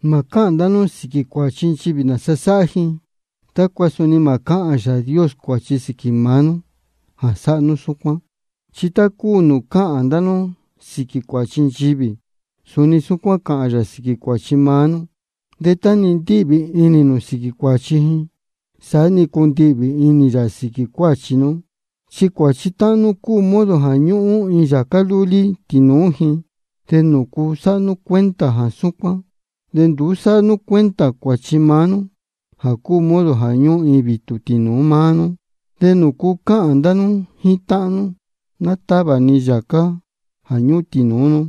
Mā cáhān ndá nú sīquī cuāchi nchivī nāsa sáhá ji, tácua suni mā cáhān Yāā Dios cuāchi sīquī maá nú jā sáhá nú súcuán. Chi tá cúu nūū cáhān ndá nú sīquī cuāchi nchivī, suni súcuán cāhān yā sīquī cuāchi maá nú. De tá-ni ndíhvī inī nū sīquī cuāchi ji, saá-ni cundihvī inī yā sīquī cuāchi nú. Chi cuāchi táhán nú cúu modo jā ñúhún iin yācá lúlí tīnūú ji. ¿De nūcu sáhá nú cuenta jā súcuán, de nduú sáhá nú cuenta cuāchi maá nú jā cúu modo jā ñúhún iin vītū tīnūú máá nú? ¿De nūcu cáhān ndá nú jíín táhán nú: Ná távā ni yācá jā ñúhún tīnūú nú?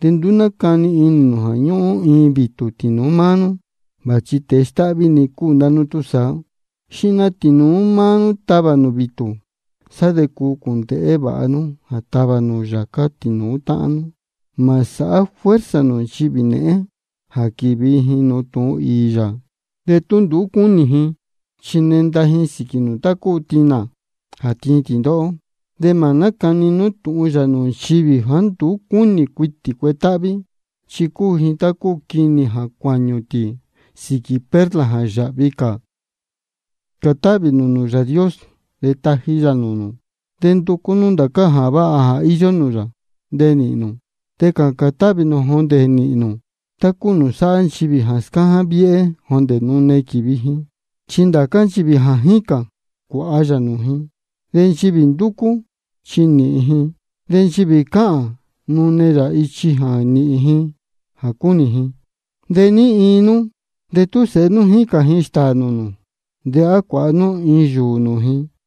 De nduú nácani inī nū jā ñúhún iin vītū tīnūú máá nú. Vāchi tēe stáhví-ni cúu ndá nú túsaá. Xihna tīnūú maá nú tavā nū vītū, sá de cuu cūndēhé vāha nú jā tavā nū yācá tīnūú táhán nú. Mā sāhá fuerza nū nchivī nēhén jā quīvi ji nūū tūhun īī yā de tú nduú cúnī ji. Chi nenda ji sīquī nū tá cúu tinā jā tíin tī ndóhó. De mā nácani nú tūhun yā nūū nchivī jāá nduú cúnī cuitī cuetáhví. Chi cúu ji tá cúu quinī jā jáñū tī sīquī perla jā ndéē yāhvi cā. Cācān nūū Yāā Dios, de taji yā nūū nū. De nducú nú ndācá jā váha jā íyó nūū yā, de nīhīn nū. De cācān táhvī nū jondē nīhīn nū, tá cúu nūū sáhá nchivī jā scáján viéhé jondē nune quīvi ji. Chi ndācá nchivī jā jícān, cuāha yā nūū ji. De nchivī ndúcú, chi nīhīn ji. De nchivī cáhān, nune yā ichi jā nīhīn ji jā cúnī ji. ¿De ní iin nú, de tú sēhe nú jícān ji stāā nūū nū, de á cuāha nú iin yūū nūū ji?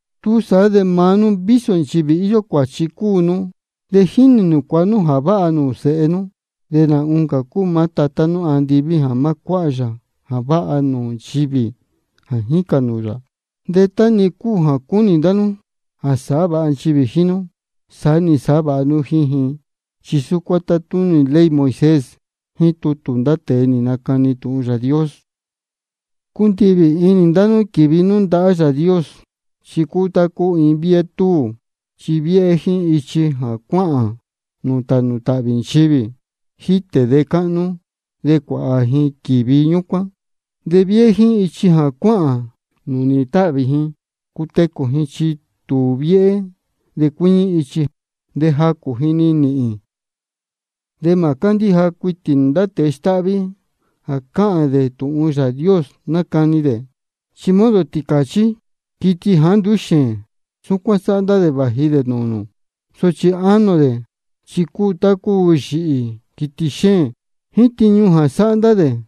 Túsaá de ndá máá nú vísō nchivī íyó cuāchi cúu nú, de jínī nū cuāha nú jā váha nūū sēhe nú. De nā oncā cúu maá Tatá nú andiví jā má cuáha yā jā váha nūū nchivī jā jícān nūū yā. De tá-ni cúu jā cúnī ndá nú jā sāhá vāha nchivī jíín nú, saá-ni sāhá vāha nú jíín ji. Chi súcuán tátúnī tutū ley Moisés jíín tutū ndá tēe nī nacani tūhun Yāā Dios. Cundihvī inī ndá nú quīvi nú ndahá Yāā Dios. Chi cúu tá cúu iin viéhé túū. Chi viéhé jíín ichi jā cuáhān nūū tānū tāhvī nchivī, jítē de cáhnú, de cuāhā ji quívi ñúcuán. De viéhé jíín ichi jā cuáhān nūū nīhīn táhvī ji cutecū ji, chi tūū viéhé de cuíñí ichi, de jacū ji-ni níhīn. De mā cándíja cuitī nū ndá tēe stáhví jā cáhān dē jā tūhun Yāā Dios nácani dē. Chi modo tīcāchí, quiti jāá nduú xēēn, súcuán sáhá ndá dē vāji dē nūū nū. Sochi inī ánō dē chi cúu dē tá cúu yīhī, quiti xéēn. Jíín tiñu sáhá ndá dē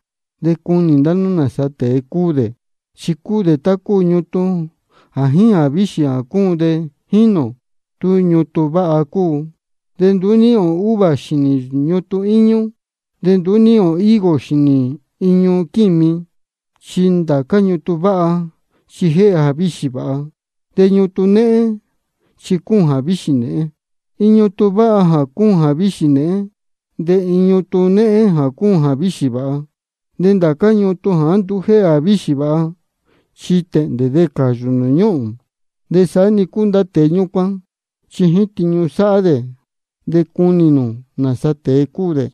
de cunī ndá nú nāsa tēe cúu dē. Chi cúu tá cúu ñutun jā jíín jāvíxī jā cúun de jínī ō tú ñutun váha cúu. De nduú níhīn ō uva xīnī ñutun íñú, de ni nduú níhīn ō higo xīnī iñu quími. Chi ndācá ñutun váha chi jéhe jāvíxī vāha, de ñutun néhén chi cúun jāvíxī nēhén. Iin ñutun váha mā cūún jāvíxī nēhén, de iin ñutun néhén mā cuáha jāvíxī vāha. De ndācá ñutun jāá nduú jéhe jāvíxī vāha, chi tēhndē de cāyū nūū ñúhūn. De saá-ni cúu ndá tēe ñúcuán, chi jíín tiñu sáhá dē de cunī nū nāsa tēe cúu dē.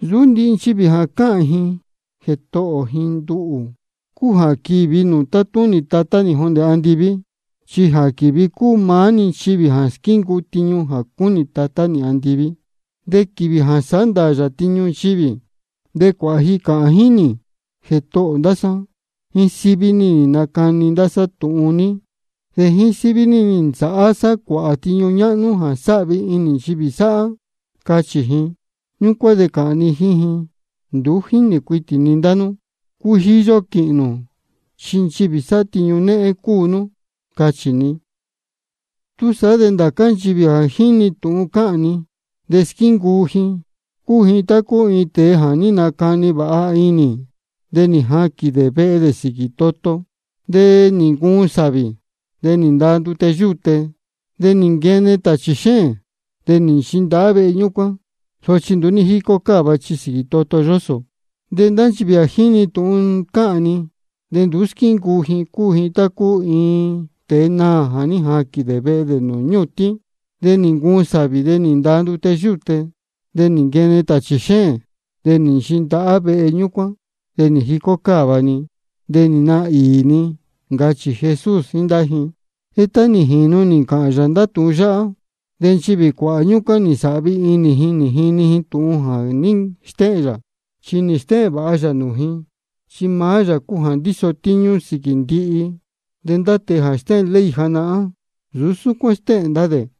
Nsūú ndihi nchivī jā cáhān ji Jētohō ji nduhū cúu jā quīvi nūū tátúnī Tatá nī jondē andiví. Chi jā quīvi cúu maá-ni nchivī jā squíncuu tiñu jā cúnī Tatá nī andiví. De quīvī jā sāhá ndāā ni tiñu nchivī, de cuāhā ji cāhān jíín nī: Jētohō ndá sá, jíín síví ní nī nacani ndá sá tūhun ní, de jíín síví ní nī ntavā sá tāchī, de jíín síví ní nī nsāhá sá cuāhā tiñu ñáhnú jā sáhvi inī nchivī sáhá. Cachī ji. Ñúcuán de cāhān ni jíín ji: Nduú jínī cuitī ni ndá nú. Cujiyo quīhīn nū, chi nchivī sáhá tiñu néhén cúu nú, cachī ni. Túsaá de ndācá nchivī jā jíni tūhun cáhān ni de squíncuu ji, cúu ji tá cúu iin tēe jā ní nacani vāha inī, de nī jaquīn dē vehe dē sīquī toto. De nī ncuun sāvī, de nī ndaa ndute yúte, de nī nquene tāchī xéēn, de nī nchindahá vehe ñúcuán. Sochi nduú ní jícó cáva, chi sīquī toto yósō. De ndá nchivī jā jíni tūhun cáhān ni de nduú squíncuu ji, cúu ji tá cúu iin tēe naā jā ní jaquīn dē vehe dē nūū ñūtín. De nī ncuun sāvī, de nī ndaa ndute yúte, de nī nquene tāchī xéēn, de nī nchindahá vehe ñúcuán. De nī jicó cáva-ni, de nī naā īī-ni, ncachī Jesús jíín ndá ji. De tá nī jīnu nī ncāhān yā ndācá tūhun yáhá, de nchivī cuāhā ñúcuán nī nsāhvi inī ji nī jini ji tūhun jā ní stéhēn yā. Chi nī stéhēn vāha yā nūū ji, chi maá yā cúu jā ndíso tíñú sīquī ndihi. De ndá tēe jā stéhēn ley janahán, nsūú súcuán stéhēn ndá dē.